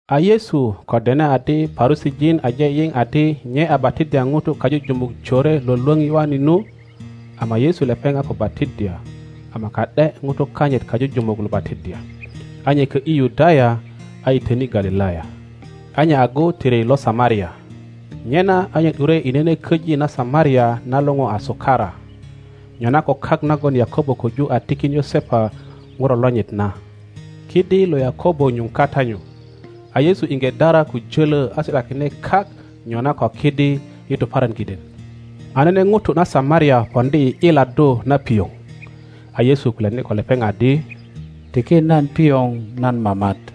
A Yesu ko dene adi Parusijin ajeyiŋ adi nye a batiddya ŋutu kajujumuk jore lwölwöŋ Yoane nu, (ama Yesu lepeŋ a ko batiddya, ama ka ’de ŋutu kanyit kajujumuk lo batiddya,) a nye kö ’yi Yudaya, a yitöni Galilaya. A nye agu tiri lo Samaria; nyena a nye ’dure i nene köji na Samaria na luŋu a Sukara, nyona ko kak nagon Yakobo köju a tikin Yosepa ŋuro lonyit na. Kidi lo Yakobo nyuŋ kata nyu. A Yesu iŋge dara ko jölö a si ’dakine kak nyona ko kidi i tuparan kiden. A nene ŋuto na Samaria poŋdi i ’yiladdu na pioŋ. A Yesu kulyani ko lepeŋ adi, Tiki nan pioŋ nan mamat;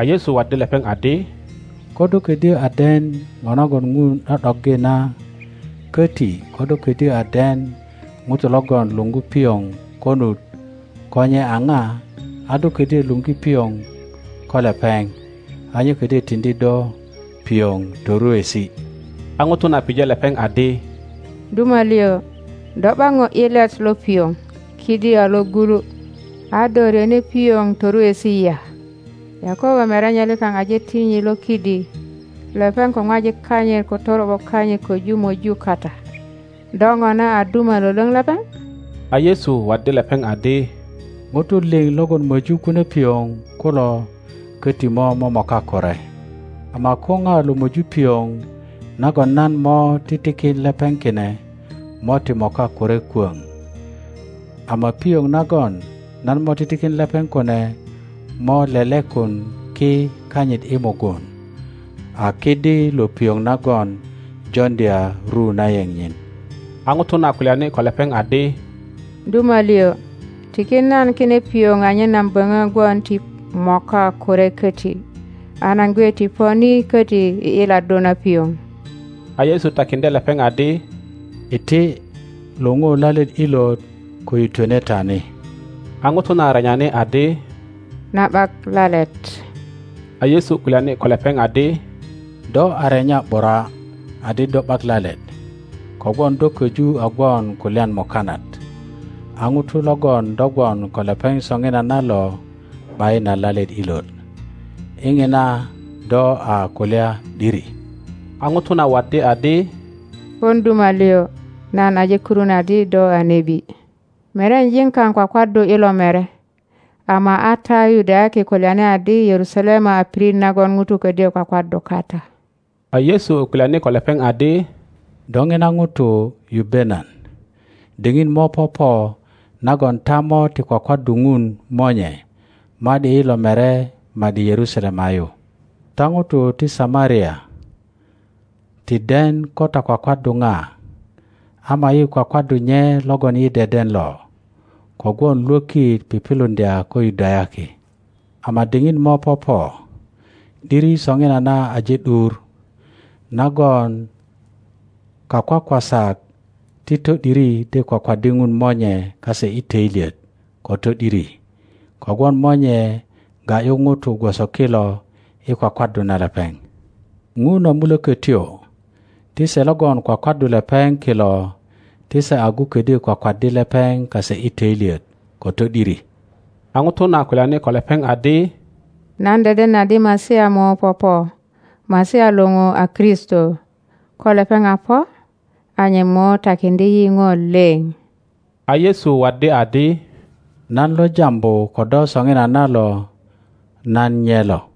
A Yesu waddi lepeŋ adi, Ko do kodyö a den Ŋo nagon Ŋun ’do ’doggi na, köti ko do kodyo a den ŋuto logon luŋgu pioŋ konut ko nye a na, a do ködyo luŋgi pioŋ ko lepeŋ, a nye ködyö tiŋdi do pioŋ toruesi. A ŋuto na pije lepeŋ adi, Duma lio, do ’bak ŋo ’yilet lo pioŋ; kidi a logulu, a do ryöni pioŋ toruesi ya? Yakobo merenye likaŋ aje tin yi lo kidi. Lepeŋ ko ŋwajik kanyit ko toro ’bo kanyit köju möju kata. Do ŋona a duma lwölwoŋ lepeŋ? A Yesu waddi lepeŋ adi, ŋutu liŋ logon möju kune pioŋ kulo köti mo momoka kure, ama ko na lo möju pioŋ nagon nan mo titikin lepeŋ kine mo ti moka kure kwöŋ; ama pioŋ nagon nan mo titikin lepeŋ kune mo lelekun ki kanyit i mugun a kidi lo pioŋ nagon joŋdya ru na yeŋ nyin. A ŋuto na kulyani ko lepeŋ adi, Duma liŋ, tiki nan kine pioŋ anyen nan böŋö gwon ti moka kure köti. a nan gwe ti po ni köti i ’yiladdu na pioŋ. A Yesu takiŋdye lepeŋ adi, Iti, luŋu lalet ilot ko yitwene ta ni. A ŋuto na renyani adi, Nan ’bak lalet. A Yesu kulyani ko lepeŋ adi, Do a renya ’bura adi do ’bak lalet, kogwon do köju a gwon ko lyan mukanat, a ŋuto logon do gwon ko lepeŋ soŋinana lo ’bayin a lalet ilot. I ŋina do a kulya ’diri. A ŋuto na waddi adi, Pon duma lio, nan aje kurun adi do a nebi. Merenyejin kao kwakwaddu i lo mere, ama a ta Yudayaki kulyani adi Yerusalema a pirit nagon ŋutu ködyö kwakwaddu kata. A Yesu kulyani ko lepeŋ adi, Do ŋina ŋuto yubbe nan, diŋit mo popo nagon ta mo ti kwakwaddu ŋun Monye ma ’di i lo mere ma ’di Yerusalema yu. Ta ŋutu ti Samaria ti den ko ta kwakwaddu ŋa; ama yi kwakwaddu nye logon yi deden lo, kogwon lwökit piŋiluŋdya ko Yudayaki. Ama diŋit mo popo, ’diri soŋinana aje ’dur, nagon kakwakwasak ti to ’diri de kwakwaddi Ŋun Monye kase i töilyet ko to ’diri, kogwon Monye ga ’yu ŋutu gwoso kilo i kwakwaddu na lepeŋ. Ŋun a Mulökötyo, ti se logon kwakwaddu lepeŋ kilo ti se agu ködyö kwakwaddi lepeŋ kase i töilyet ko to ’diri. a ŋuto na kulyani ko lepeŋ adi, Nan deden adi Masia mo popo. (Masia lupu a Kristo.) Ko lepeŋ a po, a nye mo takiŋdye yi ŋo lio. A Yesu waddi adi, Nan lo jambu ko do soŋinana lo, nan nyelo.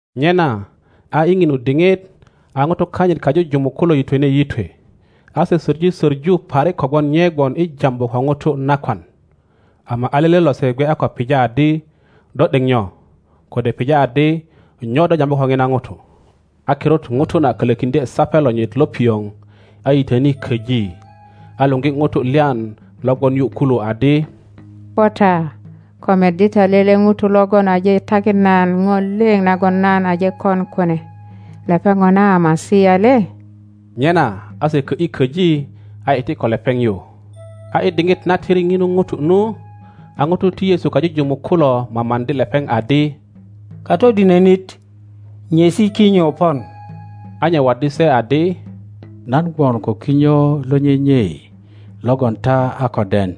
Nyena a i ŋinu diŋit, a ŋutu kanyit kajujumuk kulo yitwene yitwe, a se söŋi söŋu parik kogwon nye gwon i jambu ko ŋuto nakwan. Ama a lele lose gwe a ko pija adi, Do ’dek nyo? Kode pija adi, Nyo do jambu ko ŋina ŋuto? A kirut ŋuto, na kölökiŋdye sape lonyit lo pioŋ, a yitöni köji, a luogi ŋutu lyan lo gwon yu kulu adi, po ta, ko meddi ta lele ŋuto logon aje takin nan ŋo lio nagon nan aje kon kune; lepeŋ Ŋona a Masia le? Nyena a se kö ’yi köji a iti ko lepeŋ yu. A i diŋit na tiri ŋinu ŋuto nu, a ŋutu ti Yesu kajujumuk kulo mamaŋdi lepeŋ adi, Katodinönit, nyesi kinyo pon. A nye waddi se adi, Nan gwon ko kinyo lo nyenyei logon ta a ko den.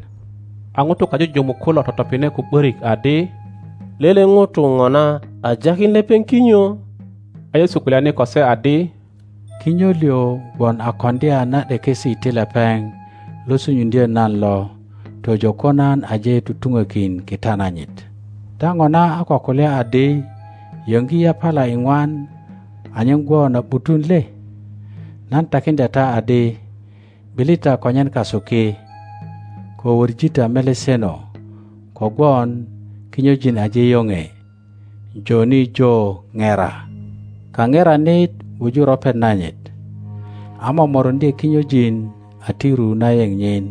A nutu kajujumuk kulo totopine ko ’börik adi, Lele ŋuto ŋona a jakin lepeŋ kinyo? a Yesu kulyani ko se adi, Kinyo lio gwon a koŋdya na ’dekesi ti lepeŋ lo sunyuŋdyö nan lo tojo ko nan aje tutuŋokin kita nanyit. Ta Ŋona a ko kulya adi, Yöŋgi yapala iŋwan anyen gwon a ’butun le? Nan takiŋdya ta adi, ’Bili ta konyen kasu ki, ko wöŋi ta meleseno, kogwon kinyojin aje yoŋe joni jo ŋera. Kaŋeranit wuju ropet nanyit, a momoruŋdye kinyojin a ti ru na yeŋ nyin,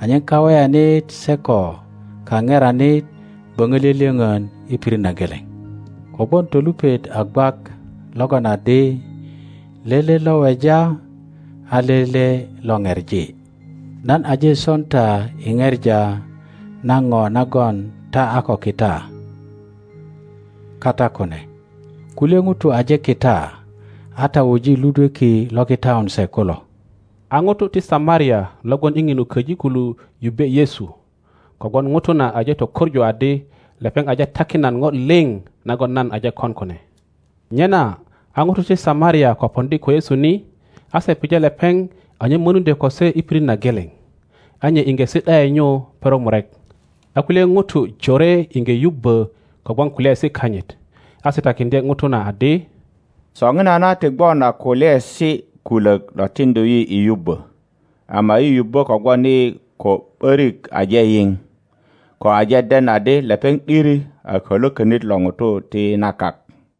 anyen kaweyanit se ko kaŋeranit böŋö lyölyöŋön i pirit na geleŋ. Kogwon tolupet a gwak logon adi, Lele lo weja a lele lo pepi. Nan aje son ta i ŋepa na ŋo nagon ta a ko kita kata kune; kulye ŋutu aje kita, a ta wuji ludweki lo kitaun se kulo. A nutu ti Samaria lo gwon i ŋinu köji kulu yubbe Yesu, kogwon ŋuto na aje tökoŋu adi, Lepeŋ aje takin nan ŋo liŋ nagon nan aje kon kune. Nyena a ŋutu ti Samaria ko poŋdi ko Yesu ni, a se pije lepeŋ anyen mönuŋdyö ko se i pirit na geleŋ; a nye iŋge si ’da ’e nyu perok murek. a kulye ŋutu jore iŋge yubbö kogwon kulyaesi kanyit, a se takiŋdye ŋuto na adi, Soŋinana ti gwon a kulyaesi kulök lo tiŋdu yi i yubbö, ama yi yubbö kogwon yi ko ’börik aje yiŋ, ko aje den adi lepeŋ ’diri a Kalwökönit lo ŋutu ti na kak.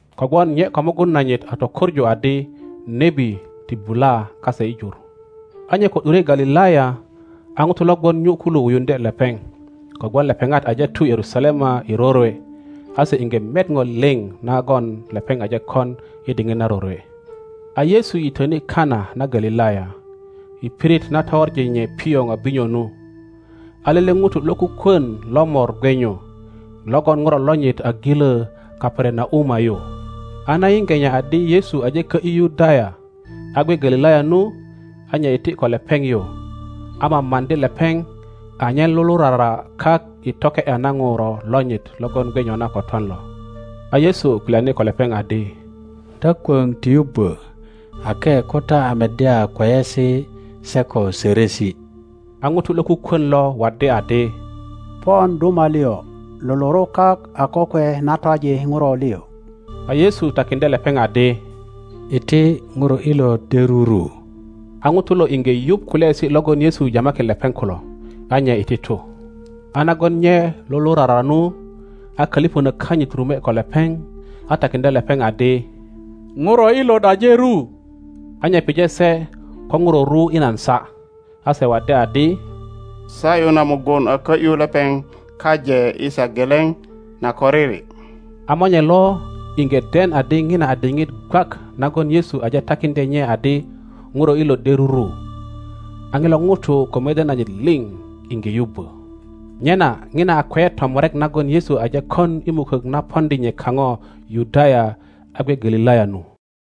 Kogwon nye ko mugun nanyit a tökoŋu adi nebi ti bula kase i jur. a nye ko ’dure Galilaya, a ŋutu lo gwon nyu kulu wuyuŋdye lepeŋ, kogwon lepeŋat aje tu Yerusalema i rorwe, a se iŋge met ŋo liŋ nagon lepeŋ aje kon i diŋit na rorwe. A Yesu yitöni Kana na Galilaya, i pirit na towoŋi nye pioŋ a binyo nu. A lele ŋuto lokukwon lo mor gwe nyu, logon ŋuro lonyit a gilö Kaperanauma yu. A na yiŋge nye adi Yesu aje kö ’yu Yudaya a gwe Galilaya nu, a nye iti ko lepeŋ yu, a mamaŋdi lepeŋ anyen lulurara kak i toke ’ya na ŋuro lonyit logon gwe nyona ko twan lo. A Yesu kulyani ko lepeŋ adi, Ta kwöŋ ti yubbö ake ko ta a meddya kweyesi se ko sörösi. A ŋuto lokukwön lo waddi adi, Pon duma lio, luluru kak a kokwe na twaji ŋuro lio. a Yesu takiŋdye lepeŋ adi, Iti, ŋuro ilot de ruru. A ŋuto lo iŋge yuŋ kulyaesi logon Yesu jamakin lepeŋ kulo, a nye iti tu. A nagon nye lulurara nu, a kölipönök kanyit rume ko lepeŋ, a takiŋdye lepeŋ adi, Ŋuro ilot aje ru. a nye pije se ko ŋuro ru i nan saa. A se waddi adi, Sa ’yu na mugun a kö ’yu lepeŋ kaje i saa geleŋ na koriri. A monye lo iŋge den adi ŋina a diŋit gwak nagon Yesu aje takiŋdye nye adi, Ŋuro ilot de ruru. A ŋilo ŋuto ko mede nanyit liŋ iŋge yubbo. Nyena ŋina a kweyet tomurek nagon Yesu aje kon i mukök na poŋdi nye kaŋo Yudaya a gwe Galilaya nu.